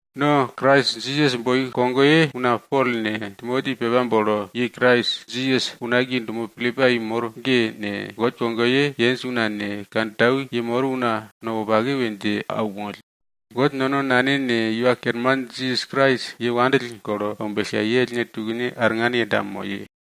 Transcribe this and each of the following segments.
No Krais Jisas nukogoye una Pol ne, Timoti pepa bolo ye Krais Jisas unakiye dumo Pilipai mor ge ne, God kogoye yenj una ne, kantau yemor una no wopake we dje aunmoll. God nono Nane ne, Iwa Kerman Jisas Krais ye wopake pille aumbellka, ye ellne tukne arngan yenda moye.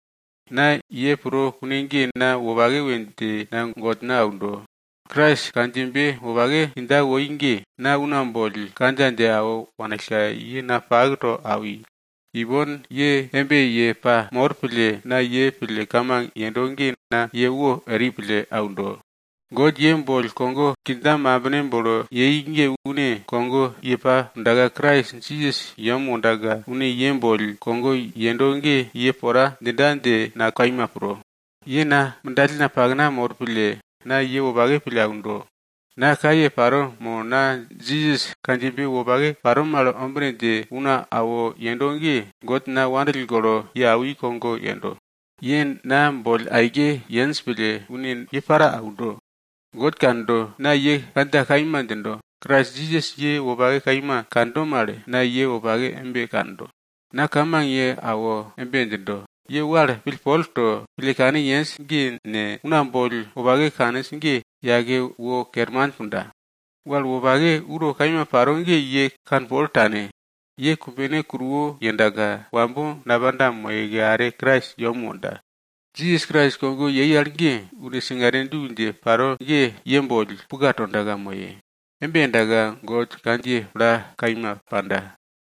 Na ye pro kune ge na wopake we dje na Godna aundo. Krais kandjiyebe wopake kindja woi ge, na una boll kandja dje awo wanillka ye na pak to awi. Ipon ye embe ye pamor pille, na ye pille kamang yendo ge na ye wo eri pille aundo. God ye boll kogo kindja mambine bolo yei ge une kogo ye pa pundaka Krais Jisas yem wondaka, une ye boll kogo yendo ge ye pora djinda dje na kaima pro. Ye na mindalna pakna mor pille, na ye wopake pille aundo. Na kaye paro mo na Jisas kandjiyebe wopake paro mal ombine dje una awo yendo ge, God na wopake pille awi al ge kogo yendo. Ye na boll aike yenj pille une ye para aundo. God kando, na ye kandja kaima djindo, Krais Jisas ye wopake kaima kando mal, na ye wopake embe kando. Na kamang ye awo embe djindo, ye wal pillpol to, pille kane yenj ge ne, una boll wopake kaninj ge, yake wor kerman punda. Wal wopake uro kaima paro ge ye kanpol tane. Ye kumbene kuruwo yendaka, wambo napanda moyeke are Krais yem wonda. Jisas Krais kogo yei al ge, une singare du dje paro ge ye boll puka tonda moye. Embe yendaka God kandjiye plato kaima panda.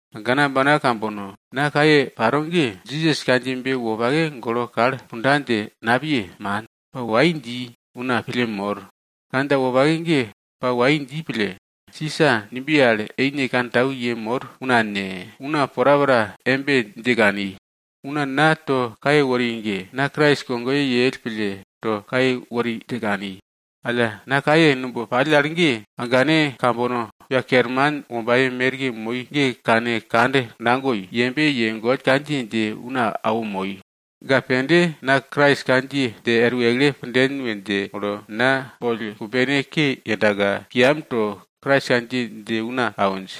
Agana ambana kambono, na kaye paro ge, Jisas kandjiyebe wopake ge golo kal punda dje napiye, man. Pa wai dji, una pille mor. Kandja wopake ge pa wai dji pille, Sisa numbiye al eine kantau yemor una ne, una porapora embe dje kani. Una na to kaye wori ge, na Krais kogo yell pille to kaye wori dje kani. Alla na kaye numb pall al ge, agane kambono, Iwa Kerman wombaye merke moi ge kane kand nagoi, yembe ye God kandjiye dje una awo moi. Ga pende na Krais kandjiye dje er wekle punden we dje molo na boll kumbene ke yendaka, kiyam to Krais kandjiye dje una awinj.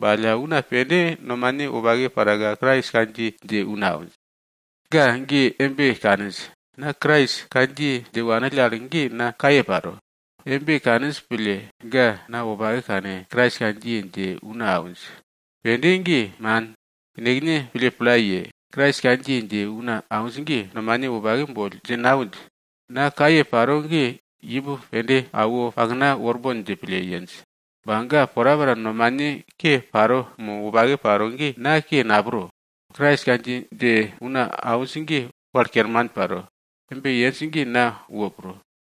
Ba alla una pende nomane wopake paraka Krais kandjiye dje una awinj. Ga ge embe kaninj, na Krais kandjiye dje wanill al ge na kaye paro. Embe kaninj pille, ga na wopake kane, Krais kandjiye dje una awinj. Pende ge man. Yenekne pille pla ye, Krais kandjiye dje una awinj ge, nomane wopake boll dje nawinj. Na kaye paro ge imb pende awo pakna worbon dje pille yenj. Ba ga porapora nomane ke paro mo wopake paro ge, na ke napro. Krais kandjiye dje una awinj ge wal kerman paro. Embe yenj ge na wo pro.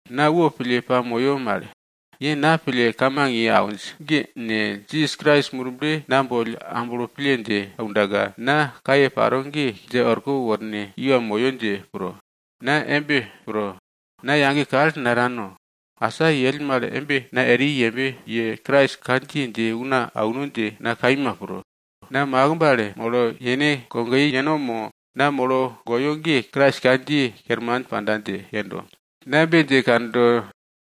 Na wopille pamoyo mal. Ye na pille kamang ye awinj ge ne, Jisas Krais Murble na boll amblo pille dje aundaka, na kaye paro ge dje orko worne kiwa moyo dje pro. Na embe pro. Na yage kal natano, asa yell mal embe na eri yembe ye Krais kandjiye dje una auno dje na kaima pro. Na makimb al molo yene kogoye yeno mo na molo goyo ge Krais kandjiye kerman panda dje yendo. Na embe dje kando,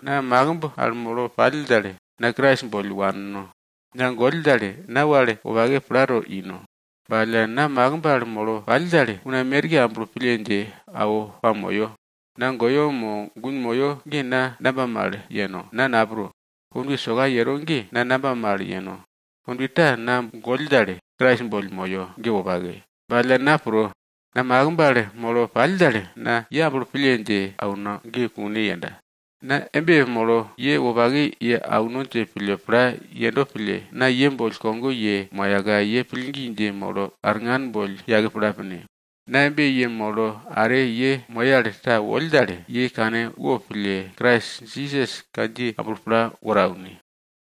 na makimb al molo pall dal, na Krais boll wanno. Na goll dal, na wal wopake plato ino. Ba alla na makimb al molo pall dal, una merke amblo pille dje awo pamoyo. Na goyo mo gun moyo ge na namba mal yeno? Na napro. Kondwe soka yero ge na namba mal yeno? Kondwe ta na goll dal, Krais boll moyo ge wopake. Ba alla na pro, na makimb al molo pall dal, na ye amblo pille dje auno ge kune yenda. Na embe molo ye wopake ye auno dje pille pla yendo pille, na ye boll kogo ye moyaka ye pillgi dje molo arngan boll yake pla pine. Na embe yemolo are ye moye al ta woll dal, ye kane wopille Krais Jisas kandjiye amblo pla woro aune.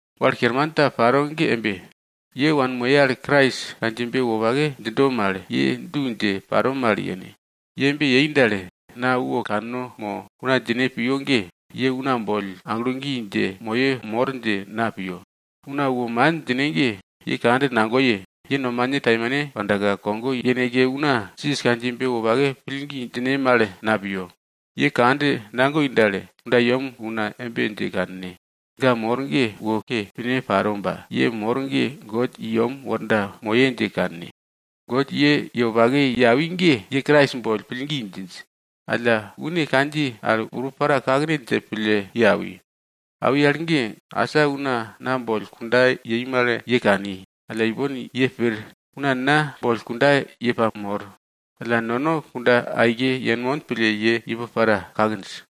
Wal kerman ta paro ge embe, ye wanmoye al Krais kandjiyebe wopake djindo mal, ye du dje paro mal yene. Ye embe yei dal, na wo kanno mo una djine piyo ge, ye una boll aglo gi dje moye mor dje na piyo. Una wo man djine ge, ye kand nagoye, ye nomane taimane pandaka, kogo yeneke una Jisas kandjiyebe wopake pillgi djine mal na piyo. Ye kand nagoi dal, kundayem una embe dje kanne. Ga mor ge wo ke pine paro ba, ye mor ge God i yem worda moye dje kanne. God ye ye wopake ye awi ge ye Krais boll pillgi djinj. Alla une kandjiye al urup para kakne dje pille ye awi. Awi al ge, asa una na boll kunda yei mal ye kani, alla ipon ye pir, una na boll kunda ye pamor. Alla nono kunda aike yenmon pille ye imb para kakinj.